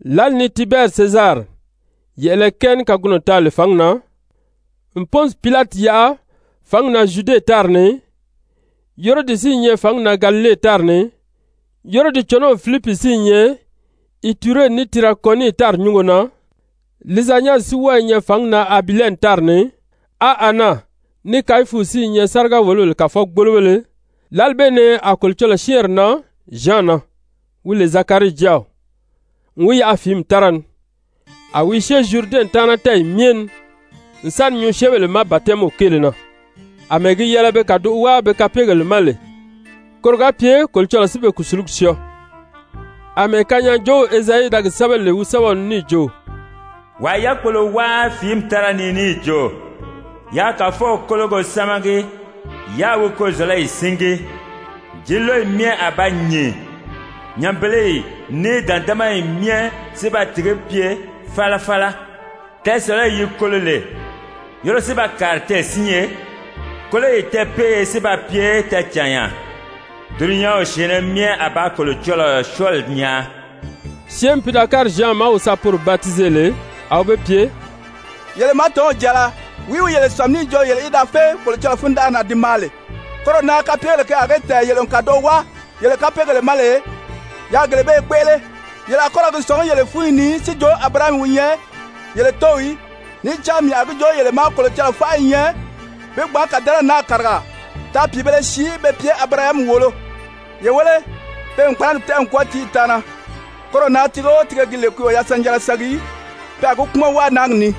Lǎli ni Tibɛri Sezari yɛ̀ʔɛlɛ kɛɛ ní kagunɔ taa lè fǎngi na, n Pɔnsi Pilati yaʔa fǎngi na Zyude tári ni, Herodi si i nyɛ fǎngi na Galile tári ni, Herodi cɔnɔw Filipi si i nyɛ Iture ní Tirakɔniti tári nyúngo na, Lizanyasi si wɔ́ɔ i nyɛ fǎngi na Abilɛni tári ni, á Ana ní Kayifu si i nyɛ sáriga-wòlobèle kàfɔgbolobéle, lǎli bee ni a Kolocɔlɔɔ syɛ́ɛnri nan Zyan na, wi lè Zakarii jáaw, n wi yaʔa fìími tára ni. A wi i syée Zyuridɛnw taana tɛ́ɛyɛ myɛ ni n sa ni nyuu syɛ́ɛnbèle ma batɛmiw kéele na, àmɛɛ gi yɛlɛ be kàdoʔo wáa be kapeegèle ma lè, koro ga pye Kolocɔlɔɔ si be kùsulugi syɔɔ. Amɛɛ kanyaajoow Ezayi da gi sɛ́bɛ lè wi sɛ́bɛw ni níì jo: «Wàa i yákpolo wáa fìími tára ni níì jo: ‹Yaa Kàfɔw kólogo sámagi, yáā wi kozɔ̀lɔyi síngi. Jǐnlɔyi myɛ a ba nyìn, nyanbeleyi ní dǎndamayi myɛ si ba tìgí pye falafala. Tɛɛsɔ̀lɔyi yi kolo lè, yoro si ba kàri tɛɛ̀sinye, kóloyi tɛɛpeeye si ba pye tɛɛcànya. Dulunyanw syɛ̀ɛnnɛ myɛ a ba Kolocɔlɔɔ syɔɔli nyaa.›» Syɛ́ɛnmi pi da kári Zyan ma wi sa poro batize lè, a wi be pye: «Yele màátɔnw jàala, wìí wi yele sàmi níì jo yele í da fé Kolocɔlɔɔ fundanʔari na di maa lè? Koro na kapyegèle ke a gi tɛ̀ɛn yele n kàdoʔo wáa yele kapeegèle ma lè, yaa gele bee kpéʔele. Yele a kɔ ra gi sɔ̀ngí yeyɛɛ fúnyi ni si jo Abirahami wi nyɛ yele tóow í! Níì cán mii a gi joo yele ma, Kolocɔlɔɔ fánʔa i nyɛ bi gbǎn kàdɛnɛri naa kàriga taa pìibēle sii be pye Abirahami wòolo. Ye wéle, pe n kpánagi tɛ́ʔɛ n kwɔ́ɔ tíiyi taana. Koro na tiige o tiige gi lè ki o yasanjanra sangi í, pe a gi kpúmɔn wáa náagi ni.»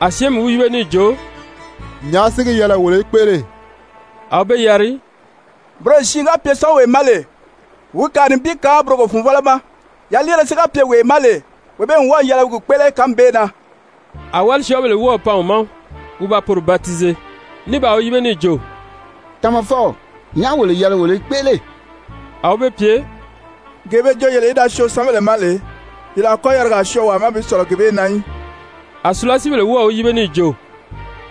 A syɛ́ɛnmi wi yíbe níì jo: «Nyàʔá si gi yɛlɛ wolo í kpéʔele?» A wi be yari: «Buroyo siin ga pye syɔ́ɔnwee ma lè, wi kàa nibin kaan burogo-fùnvɔlɔ ma. Yaliire si ga pye wee ma lè, wee bee n wɔ́ɔ̀ yɛlɛ wi gi kpéʔele kánmi bee na.» A wálisyɔɔbèle wɔ́ɔ̀ pan wi ma wi ba poro batize, ní baa wi yíbe níì jo: «Tamafɔw, nyàʔá wolo yɛlɛ wolo í kpéʔele?» A wi be pye: «Gee be jo yele í da syoo syɛ́ɛnbèle ma lè, yele a kɔ́ yarigaa syɔɔ wàa ma bi sɔ̀lɔ gee bee na í.» A sùlasiibèle wɔ́ɔ̀ wi yíbe níì jo: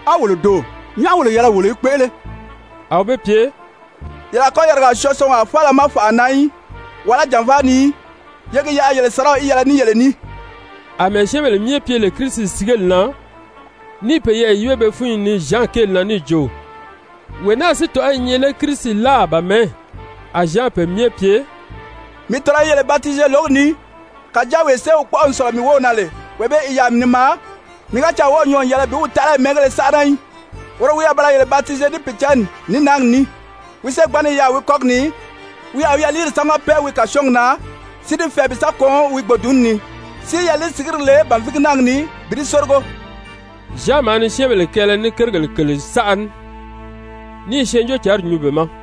«A wolo doò? Nyàʔá wolo yɛlɛ wolo í kpéʔele?» A wi be pye: «Yele a kɔ́ yarigaa syɔɔ syɔɔnwaa faala ma fànʔa na í, wàlá jànvaa ni í. Ye gi yaʔa yele sàraw í yɛlɛ ní yele ní.» Amɛɛ syɛ́ɛnbèle myɛ pye lè Kirisi sigeli na ní i peyɛɛ yíbe be fúnyi ni Zyan kéeli na níì jo: Wee naa si tɔ̀ʔɔ́ i nyɛ lé Kirisi láà ba mɛ̀ɛ́? A Zyan pe myɛ pye: «Mii tɔ̀nɔ́ i yele batize lǒgi ni, kàjáa wee sée wi kpɔ́ʔɔ n sɔ̀lɔ mii wów na lè, wee bee i yaà ni maa. Mii ga caa wɔ́ɔ̀ nyɔɔ n yɛlɛ bi wi taʔalayi mɛ́ɛngéle sánʔana í. Woro wi a ba ra yele batize ní Pìicǎnni, ní náagi ní. Wi ségbanni i yaà wi kɔ́gi ni, wi a wi yaliiri sámaga pɛ́ɛ wi kàsyɔɔgi na si di fɛɛ bi sa kɔn wi gbòdunni ni, si yaliisigiri le bànvigi náagi ni bi di sórigo.» Zyan maa ni syɛ́ɛnbèle kɛɛlɛ ní kérigèle kèle saʔa ní, ní i Syɛɛnjóocǎnri nyuu be ma.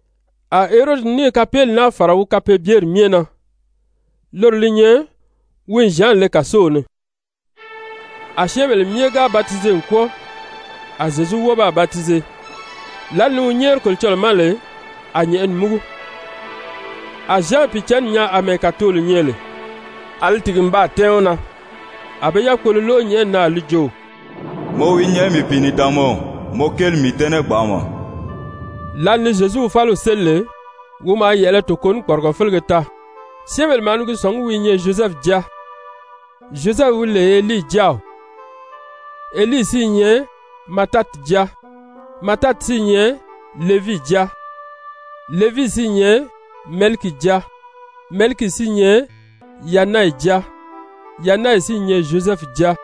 A Herodi níì kapeeli naa fàra wi kapeebyeri myɛ na, loro li nyɛ wi n Zyan le kàsow ni. A syɛ́ɛnbèle myɛ ga batize n kwɔ́ɔ, a Zyezu wɔ́ɔ baa batize. Lǎli ni wi nyɛ́ɛri Kolocɔlɔɔ ma lè, a nyɛ̀ʔɛni múgu. A Zyan Pìicǎnni nyaa àmɛɛ kàtolo nyɛ lè, a li tìgi n baa tɛ́ɛn wi na. A be yákpolo lóʔo nyɛ̀ʔɛni na a li jo: «Mɔ wi nyɛ mii Pìinidaanmaw, mɔ kéeli n mii dɛ́nɛ gbanʔama.» Lǎli ni Zyezu wi fáliw séli lè, wi maa yɛ̀ʔɛlɛ toko ní kpɔrigɔ félege taa. Syɛ́ɛnbèle maa ni gi sɔ̀ngí wi i nyɛ Zyozɛfu jáa. Zyozɛfu wi lè Helii jáaw, Helii si i nyɛ Matati jáa, Matati si i nyɛ Levii jáa, Levii si i nyɛ Mɛlikii jáa, Mɛlikii si i nyɛ Yanayi jáa, Yanayi si i nyɛ Zyozɛfu jáa,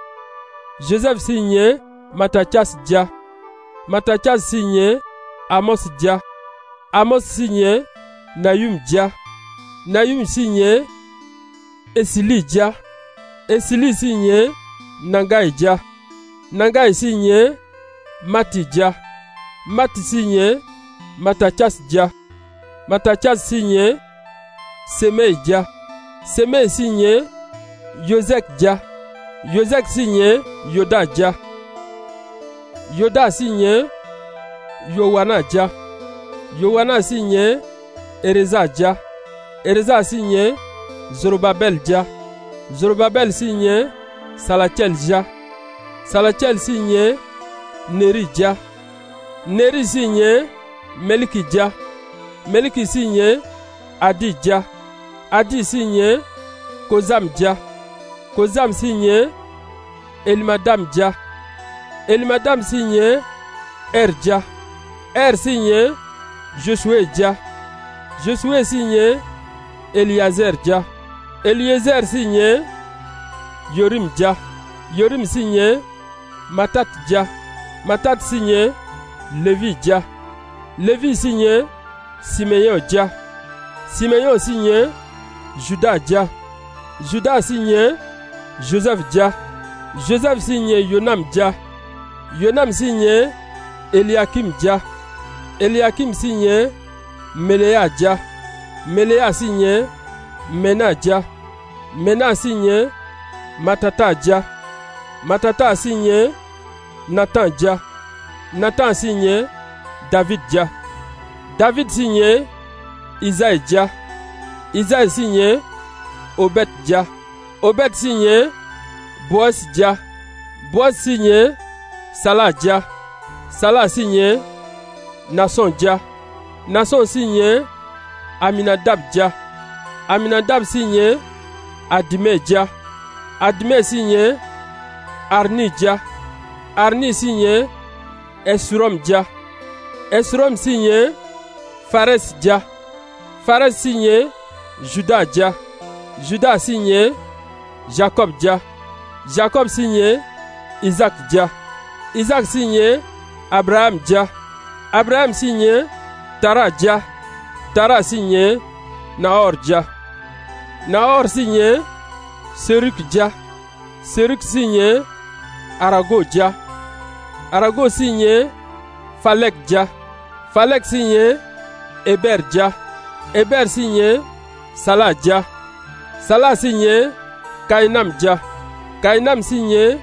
Zyozɛfu si i nyɛ Matatyasi jáa, Matatyasi si i nyɛ Amɔsi jáa, Amɔsi si i nyɛ Nahumi jáa, Nahumi si i nyɛ Esilii jáa, Esilii si i nyɛ Nagayi jáa, Nagayi si i nyɛ Mati jáa, Mati si i nyɛ Matatyasi jáa, Matatyasi si i nyɛ Semɛyi jáa, Semɛyi si i nyɛ Yozɛki jáa, Yozɛki si i nyɛ Yoda jáa, Yoda si i nyɛ Yowana jáa, Yowana si i nyɛ Ereza jáa, Ereza si i nyɛ Zorobabɛli jáa, Zorobabɛli si i nyɛ Salatyɛli jáa, Salatyɛli si i nyɛ Nerii jáa, Nerii si i nyɛ Mɛlikii jáa Mɛlikii si i nyɛ Adii jáa, Adii si i nyɛ Kozami jáa, Kozami si i nyɛ Elimadami jáa, Elimadami si i nyɛ Ɛri jáa, Ɛri si i nyɛ Zyozuwe jáa, Zyozuwe si i nyɛ Eliyezɛɛri jáa, Eliyezɛɛri si i nyɛ Yorimi jáa, Yorimi si i nyɛ Matati jáa, Matati si i nyɛ Levii jáa, Levii si i nyɛ Simeyɔn jáa, Simeyɔn si i nyɛ Zyuda jáa, Zyuda si i nyɛ Zyozɛfu jáa, Zyozɛfu si i nyɛ Yonami jáa, Yonami si i nyɛ Eliyakimi jáa, Eliyakimi si i nyɛ Meleya jáa, Meleya si i nyɛ Mɛna jáa, Mɛna si i nyɛ Matata jáa, Matata si i nyɛ Natan jáa, Natan si i nyɛ Davidi jáa, Davidi si i nyɛ Izayi jáa, Izayi si i nyɛ Obɛdi jáa, Obɛdi si i nyɛ Bowɔzi jáa, Bowɔzi si i nyɛ Sala jáa, Sala si i nyɛ Naasɔn jáa, Naasɔn si i nyɛ Aminadabi jáa, Aminadabi si i nyɛ Adimɛn jáa, Adimɛn si i nyɛ Arinii jáa, Arinii si i nyɛ Hesurɔn jáa, Hesurɔn si i nyɛ Farɛsi jáa, Farɛsi si i nyɛ Zyuda jáa, Zyuda si i nyɛ Zyakɔbi jáa, Zyakɔbi si i nyɛ Izaaki jáa, Izaaki si i nyɛ Abirahami jáa, Abirahami si i nyɛ Tara jáa, Tara si i nyɛ Nahɔri jáa, Nahɔri si i nyɛ Serugi jáa, Serugi si i nyɛ Arago jáa, Arago si i nyɛ Falɛki jáa, Falɛki si i nyɛ Hebɛɛri jáa, Hebɛɛri si i nyɛ Sala jáa, Sala si i nyɛ Kayinami jáa, Kayinami si i nyɛ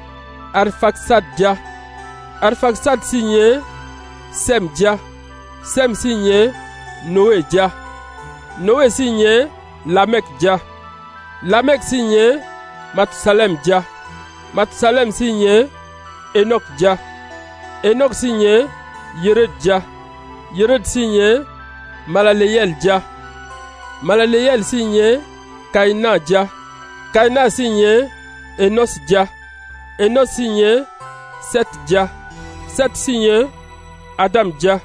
Arifakisadi jáa, Arifakisadi si i nyɛ Sɛmi jáa, Sɛmi si i nyɛ Nowe jáa, Nowe si i nyɛ Lamɛki jáa, Lamɛki si i nyɛ Matusalɛmi jáa, Matusalɛmi si i nyɛ Henɔki jáa, Henɔki si i nyɛ Yeredi jáa,Yeredi si i nyɛ Malaleyɛli jáa, Malaleyɛli si i nyɛ Kayinan jáa, Kayinan si i nyɛ Enɔsyi jáa, Enɔsyi si i nyɛ Sɛti jáa, Sɛti si i nyɛ Adami jáa,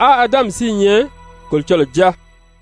á Adami si i nyɛ Kolocɔlɔɔ jáa.